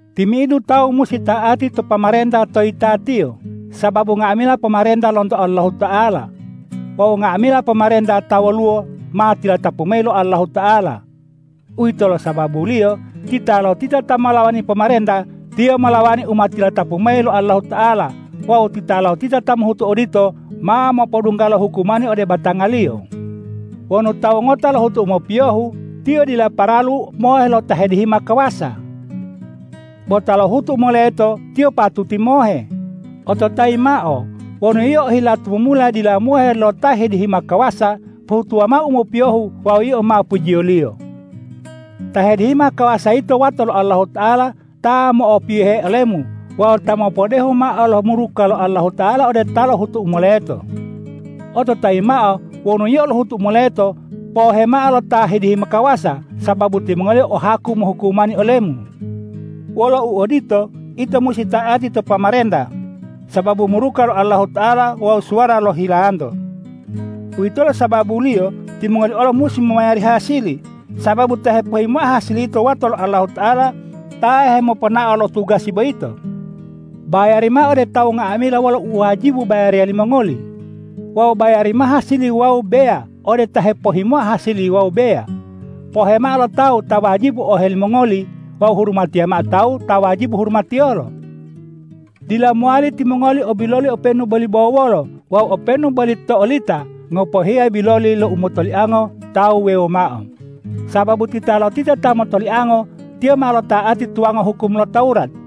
Timi'idu tawu musi ta'ati to pomarenta ta to yitatiyo, sababu nga'amila pomarenta lonto Allahuta'ala. Wawu nga'amila pomarenta ta woluwo, ma tilatapu mayi lo Allahuta'ala. Uwitolo sababuliyo titalotita ta molawani pomarenta, tiyo molawani u ma tilatapu mayi lo Allahuta'ala; wawu titalotita ta mohutu odito, ma mopodungga lo hukumani ode batangaliyo. Wonu tawu ngota lohutu u mopiyohu, tiyo dila paralu mohe lo ta hedihima kawasa. Bo ta lohutu u moleto, tiyo patuti mohe. Ototayi mao: Wonu yio ohila tumumula dila mohe lo ta hedihima kawasa, pohutuwa mao u mopiyohu wawu yio ma pujiyoliyo. Ta hedihima kawasa yito wato lo Allahuta'ala ta mo'opiyohe olemu wawu ta mopodehu mao lo muruka lo Allahuta'ala ode ta lohutu u moleto. Ototayi mao: Wonu yio lohutu u moleto, pohemao lo ta hedihima kawasa, sababu timongoliyo o haku mohukumani olemu. Wolo uodito, ito musi ta'ati to pomarenta sababu muruka lo Allahuta'ala wawu suwara lo hilanto. Uwitolo sababuliyo timongoli olo musi momayari hasili, sababu ta hepohhimoa hasili yito wato lo Allahuta'ala ta hemoponao lo tugasi boyito. Bayari mao ode tawu nga'amila wolo u wajibu bayariya limongoli. Wawu bayari mao hasili wawu beya ode ta hepohhimoa hasili wawu beya. Pohe mao lo tawu ta wajibu ohe limongoli wawu hurumatiya mao tawu ta wajibu hurumatiyolo. Dila mowali timongoli o biloli openu boli bo wolo wawu openu boli to olita ngopohiya biloli lo umotoliango tawu wuwewo mao, sababu titalotita ta motoliango, tiyo ma lota'ati tuwango hukum lo Tawurat.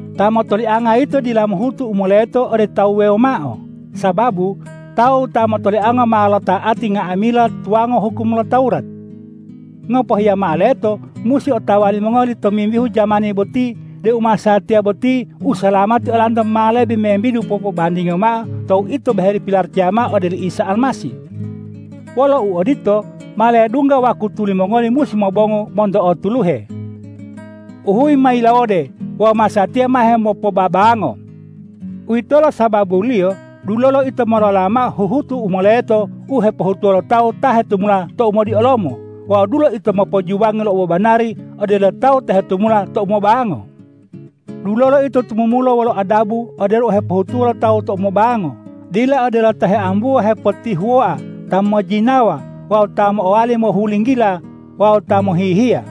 Ta motolianga yito dila mohutu u moleto ode tawu wuwewo mao, sababu tawu ta motoliango ma lota'ati nga'amila tuwango hukum lo Tawurat. Ngopohiya mao leto musi otawa limongoli tomimbihu jamani boti deu masatiya boti usalamati olanto ma lebe membidu popobandingiyo mao tou ito boheli pilaracaya mao ode oli Isa Almasih. Wolo uodito, ma ledungga wakutu limongoli musi mobongu monto o tuluhe. Uhuyi ma yilawode wawu masatiya ma hemopobabango. Uwitolo sababuliyo dulolo ito molola mao huhutu u moleto u hepohutuwo lo tawu ta hetumula tou modiolomo wawu dulo ito mopojuwangi lo obobanari odelo tawu ta hetumula tou mobango. Dulolo ito tumumula wolo adabu odelo u hepohutuwo lo tawu tou mobango, dila odelo ta heambuwa hepotihuwoa, ta mojjinawa wawu ta mo'owali mohulinggila wawu ta mohihiya.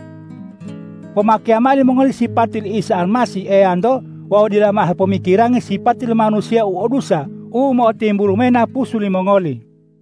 Pomakeya mao limongoli sipati li Isa Almasih Eyanto wawu dila mao hepomikirangi sipati lo manusiya o dusa u mo'otimbulu mayi napusu limongoli.